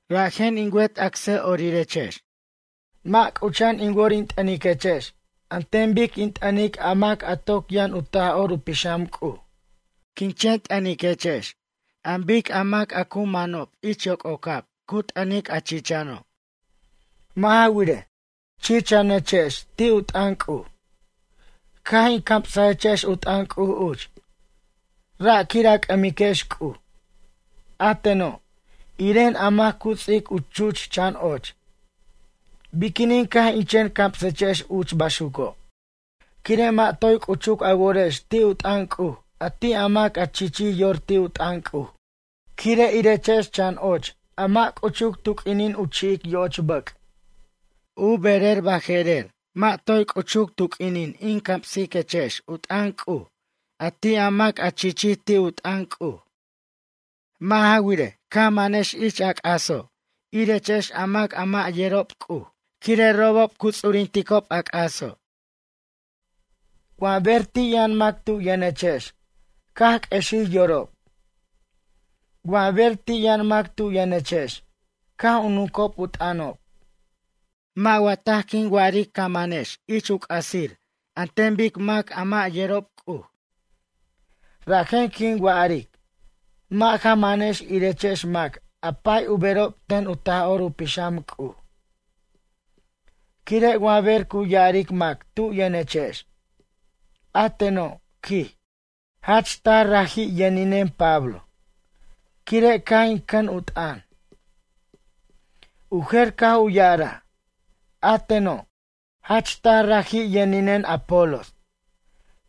Rajen in wet acsa'orirex, mʌ' c'ucha'an in wor in t'ʌniquechex an ten bic in t'ʌnic a mac a toc yʌn u Taj'or u Pixam C'uj. Quin chen t'ʌniquechex an bic mac a cu man ich yoc'ocab cu t'ʌnic a chichano'. Mʌ' ja wirej, chichanechex ti' u t'ʌn C'uj. Caj in camsechex u t'ʌn C'uj uch, ra' quir a c'ʌmiquex C'uj. A teno', iren mac a cu ts'ic u chuch chan och. Biquinin caj in chen camsechex uch baxuco'? Quire' mʌ' toy c'uchuc a worex ti' u t'ʌn C'uj a ti' a mac a chichij yor ti' u t'ʌn C'uj. Quire' irechex chan och a mʌ' c'uchuc tu q'uinin u chi'ic yoch bʌc'. U berer bʌje'rer, mʌ' toy c'uchuc tu q'uinin in camsiquechex u t'ʌn C'uj a ti' a mac a chichij ti' u t'ʌn C'uj. Mʌ' ja wirej, caj a manex ich a c'aso' irechex a mac a mʌ' yerob C'uj, quire' robob cu ts'urinticob a c'aso'. Wa ber ti' yʌn mac tu yʌnechex caj q'uexij yorob. Wa ber ti' yʌn mac tu yʌnechex caj u nuncob u t'ʌnob, mʌ' wa taj quin wa'aric ca manex ich u c'asir an ten bic mac a mʌ' yerob C'uj? Rajen quin wa'aric, mʌ' ja manex irechex mac a pay u berob ten u Taj'or u Pixam C'uj. Quire' wa ber cu ya'aric mac tu yʌnechex: “A teno', quij, jach taj raji' yʌninen Pablo, quire' caj in cʌn u t'ʌn.” U jer caj u ya'araj: “A teno', jach taj raji yʌninen Apolos,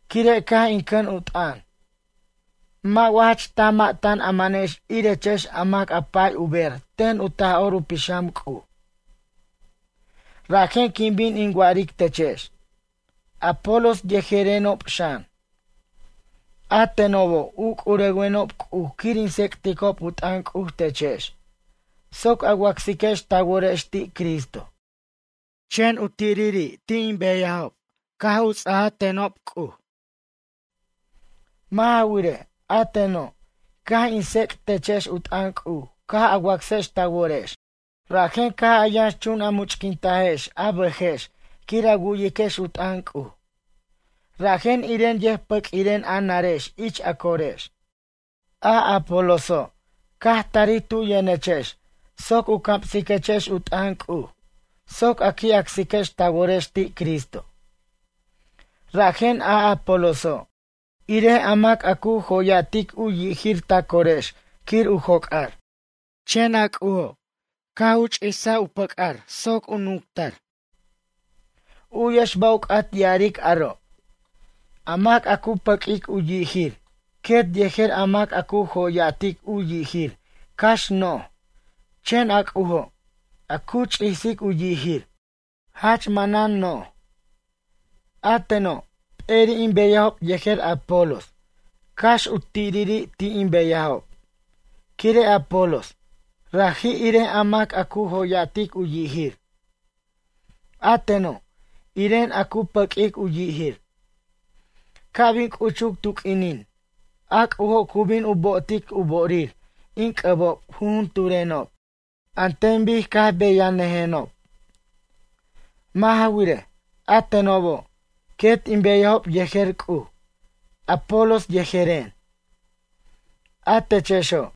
quire' caj in cʌn u t'ʌn.” Mʌ' wa jach taj mʌ' tan a manex irechex a mac a pay u ber ten u Taj'or u Pixam C'uj? Rajen quin bin in wa'aric techex. Apolos yejerenob xan, a tenobo' u c'urewenob C'uj quir in tsec'ticob u t'ʌn C'uj techex, soc a wacsiquex ta worex ti' Cristo. Chen u tiriri' ti' in beyajob, caj ts'aja a tenobo' C'uj a tenobo'. Mʌ' ja wirej, a teno', caj in tsec' techex u t'ʌn C'uj caj a wacsex ta worex, rajen caj a yʌnxchun a much'quintajex a bʌjex quir a wu'yiquex u t'ʌn C'uj. Rajen iren yʌjpʌq'uiren a narex ich a corex. A Apoloso', caj tarij tu' yʌnechex soc u camsiquechex u t'ʌn C'uj soc a qui' acsiquex ta worex ti' Cristo. Rajen a Apoloso', irej a mac a cu jo'ya'tic u yijir ta corex quir u joc'ar. Chen a C'ujo', caj u ch'isaj u pʌc'ar soc u nunctar. U'yex ba' u c'at ya'aric aro'. A mac a cu pʌq'uic u yijir quet yejer a mac a cu jo'ya'tic u yijir cax noj, chen a C'ujo', a cu ch'isic u yijir, jach manan noj. A teno', p'eri' in beyajob yejer Apolos cax u tiriri' ti' in beyajob, quire' Apolos, raji' irej a mac a cu jo'ya'tic u yijir. A teno', iren a cu pʌq'uic u yijir. Ca' bin c'uchuc tu q'uinin, a C'ujo' cu bin u bo'otic u bo'orir in c'ʌbob jujunturenob, an ten bic caj beyajnʌjenob. Mʌ' ja wirej, a tenobo', quet in beyajob yejer C'uj, Apolos yejeren. A techexo',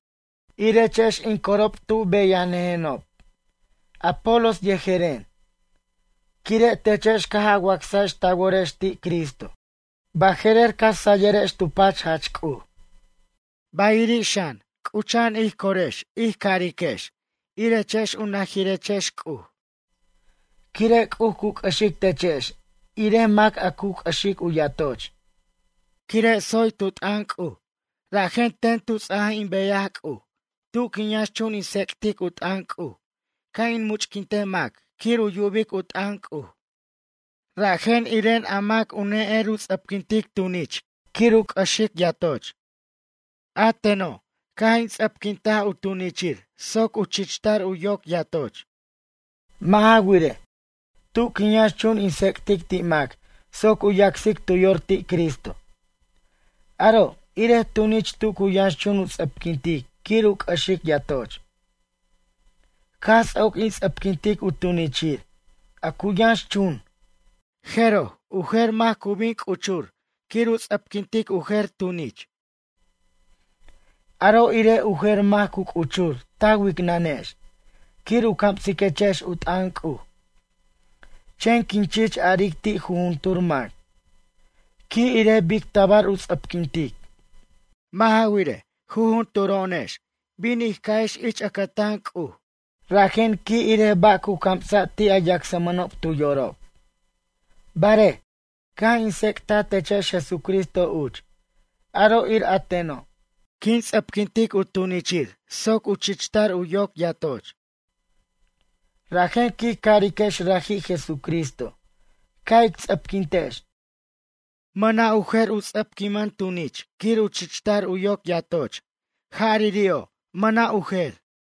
irechex in corob tu beyajnʌjenob Apolos yejeren, quire' techex caj a wacsajex ta worex ti' Cristo, baje'rer ca sayirex tu pach jach C'uj. Bayiri' xan, c'ucha'an ij corex ij cariquex irechex u najirechex C'uj, quire' C'uj cu c'ʌxic techex irej mac a cu c'ʌxic u yatoch. Quire' tsoy tu t'ʌn C'uj, rajen ts'a'b in beyaj ten C'uj tu quin yʌnxchun in tsec'tic u t'ʌn C'uj ca' in much'quint mac quir u yubic u t'ʌn C'uj. Rajen iren a mac ne'er u ts'ʌpquintic tunich quir u c'ʌxic yatoch. A teno', caj in ts'ʌpquinta tunichir soc u chichtar u yoc yatoch. Mʌ' ja wirej, tu quin yʌnxchun in tsec'tic ti' mac soc u yacsic tu yor ti' Cristo. Aro' irej tunich tu cu yʌnxchun u ts'ʌpquintic quir u c'ʌxic yatoch. Caj ts'oc in ts'ʌpquintic u tunichir, a cu yʌnxchun, jeroj, u jer mac cu bin u c'uchur quir u ts'ʌpquintic u jer tunich. Aro' irej u jer mac cu c'uchur ta wicnʌnex, quir u camsiquechex u t'ʌn C'uj. Chen quin chich aric ti' jujuntur mac: “Qui' irej bic tabar u ts'ʌpquintic.” Mʌ' ja wirej, jujunturo'onex, bin in ca'ex ich ʌcʌtan C'uj, rajen qui' irej ba' cu camsa' ti' a yacsmʌnob tu yorob. Barej, caj in tsec'taj techex Jesucristo uch, aro' ir a teno', quin ts'ʌpquintic u tunichir soc u chichtar u yoc yatoch. Rajen quij cariquex raji' Jesucristo caj ij ts'ʌpquintex, mʌna' u jer u ts'ʌpquinir tunich quir u chichtar u yoc yatoch, jariri'o', mʌna' u jer.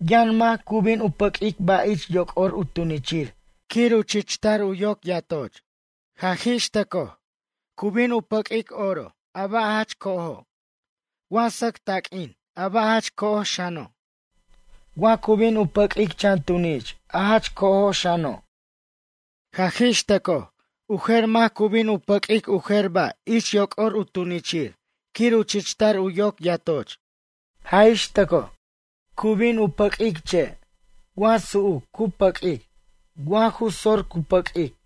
Yʌn mac cu bin u pʌq'uic ba' ich yoc'or u tunichir quir u chichtar u yoc yatoch. Jaj ix tʌcoj, cu bin u pʌq'uic oro, a ba' jach co'ojo'. Wa sʌc taq'uin, a ba' jach co'oj xano'. Wa cu bin u pʌq'uic chan tunich a jach co'oj xano'. Jaj ix tʌcoj, u jer mac cu bin u pʌq'uic u jer ba' ich yoc'or u tunichir quir u chichtar u yoc yatoch. Jaj ix tʌcoj, cu bin u pʌq'uic che', wa su'uc cu pʌq'uic, wa ju sor cu pʌq'uic.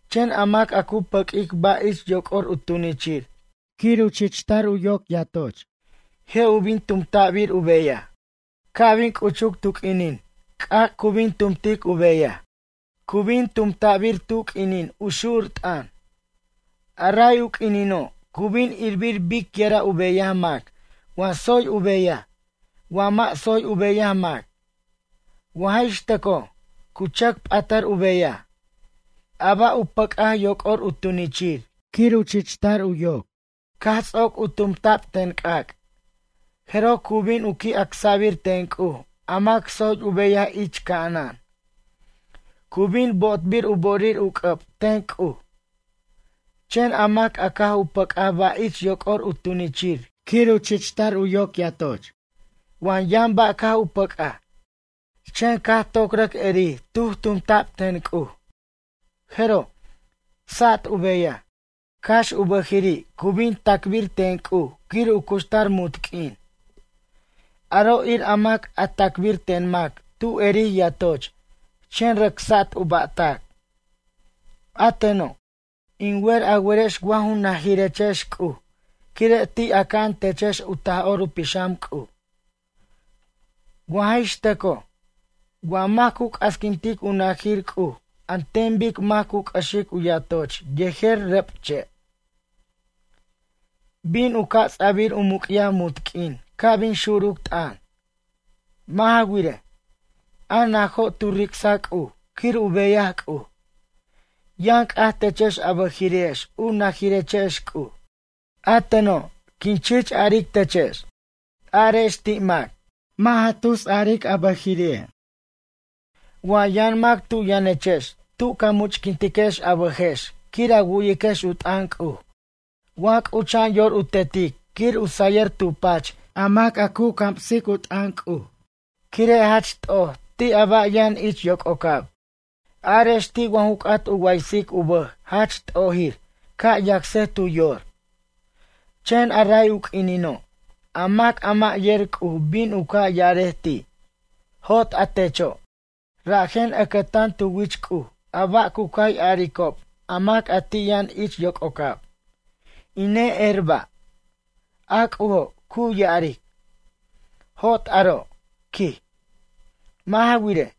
Chen a mac a cu pʌq'uic ba' ich yoc'or u tunichir quir u chichtar u yoc yatoch, je' u bin tumta'bir u beyaj. Ca' bin c'uchuc tu q'uinin, c'ac' cu bin tumtic u beyaj. Cu bin tumta'bir tu q'uinin u xur t'ʌn. A ray u q'uinino', cu bin irbir biquira' u beyaj mac wa tsoy u beyaj, wa mʌ' tsoy u beyaj mac. Wa jix tʌcoj cu chʌc p'atar u beyaj, a ba' u pʌc'aj yoc'or u tunichir quir u chichtar u yoc, caj ts'oc u tumta'b ten c'ac', jeroj cu bin qui' acsa'bir ten C'uj a mac tsoy u beyaj ich ca'anan. Cu bin bo'otbir u bo'orir u c'ʌb ten C'uj. Chen a mac a caj u pʌc'aj ba' ich yoc'or u tunichir quir u chichtar u yoc yatoch, wa yʌn ba' caj u pʌc'aj, chen caj toc rʌc erij tuj tumta'b ten C'uj, jeroj, sat u beyaj, cax u bʌjiri' cu bin tacbir ten C'uj quir u cuxtar munt q'uin. Aro' ir a mac a tacbir ten mac tu erij yatoch, chen rʌc sat u ba'tac. A teno', in wer a werex wa ju najirechex C'uj quire' ti' aca'an techex u Taj'or u Pixam C'uj. Wa jix tʌcoj, wa mac cu c'asquintic u najir C'uj an ten bic mac cu c'ʌxic u yatoch yejer rʌb che'. Bin u ca' ts'a'bir u muc'yaj munt q'uin ca' bin xuruc t'ʌn. Mʌ' ja wirej, a najo' tu ric'sa C'uj quir u beyaj C'uj. Yʌn c'aj techex a bʌjiri'ex u najirechex C'uj. A teno', quin chich aric techex. Arex ti' mac: “Mʌ' ja tus aric a bʌjiri'.” Wa yʌn mac tu' yʌnechex tu ca much'quintiquex a bʌjex quir a wu'yiquex u t'ʌn C'uj wa c'ucha'an yor u tetic quir u sayir tu pach a mac a camsic u t'ʌn C'uj, quire' jach t'oj ti' a ba' yʌn ich yoc'ocab. Arex ti' wa ju c'at u waysic u bʌj jach t'ojir, ca' yacsej tu yor. Chen a ray u q'uinino', a mac a mʌ' yer C'uj bin u ca' ya'arej ti': “Jot a techo'.” Rajen ʌcʌtan tu wich C'uj a ba' cu cay aricob a mac a ti' yʌn ich yoc'ocab: “In ne'er ba'.” A C'ujo', cu ya'aric: “Jot aro'”, quij. Mʌ' ja wirej,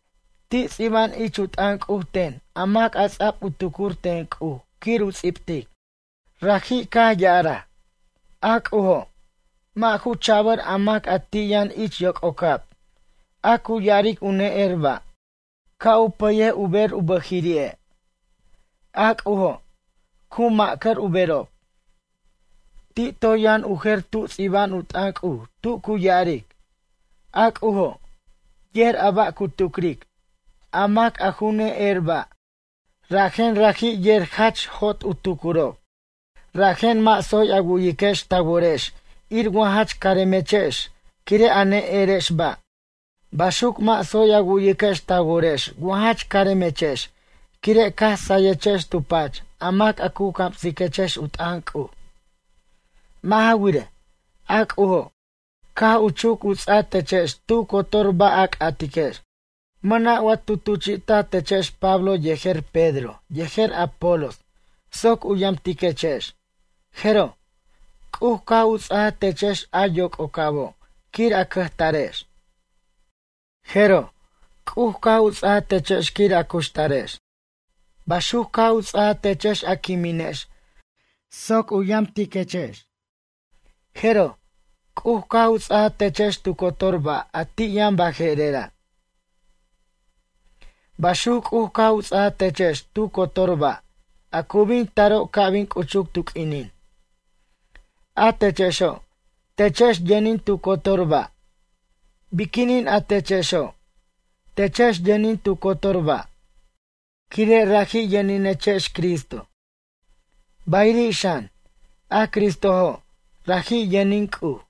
ti' ts'iba'an ich u t'ʌn C'uj ten a mac ts'a'b u tucur ten C'uj quir u ts'ibtic. Raji' caj ya'araj: “A C'ujo', mʌ' ju cha'bʌr a mac a ti' yʌn ich yoc'ocab, a cu ya'aric u ne'er ba' ca' u pʌyej u ber u bʌjiri'e'. A C'ujo', cu macʌr u berob.” Ti' toy yʌn u jer tu ts'iba'an u t'ʌn C'uj tu cu ya'aric: “A C'ujo', yer a ba' cu tucric, a mac a ju ne'er ba' rajen raji' yer jach jot u tucurob.” Rajen mʌ' tsoy a wu'yiquex ta worex ir wa jach caremechex quire' a ne'erex ba'. Baxuc mʌ' tsoy a wu'yiquex ta worex wa jach caremechex quire' caj sayechex tu pach a mac a cu camsiquex u t'ʌn C'uj. Mʌ' ja wirej, a C'ujo', caj u chuc u ts'a techex tu cotor ba' a c'atiquex. Mʌna' wa tu tuchi'ta techex Pablo yejer Pedro yejer Apolos soc u yamtiquechex? Jeroj, C'uj caj u ts'aja techex a yoc'ocabo' quir a cʌjtarex. Jeroj, C'uj caj u ts'aja techex quir a cuxtarex, baxuc caj u ts'aja techex a quiminex soc u yamtiquechex. Jeroj, C'uj caj u ts'aja techex tu cotor ba' a ti' yʌn baje'rera', baxuc C'uj caj u ts'aja techex tu cotor ba', a cu bin taro' ca' bin c'uchuc tu q'uinin. A techexo', techex yʌnin tu cotor ba'. Biquinin a techexo', techex yʌnin tu cotor ba', quire' raji' yʌninechex Cristo. Bayiri' xan, a Cristojo', raji' yʌnin C'uj.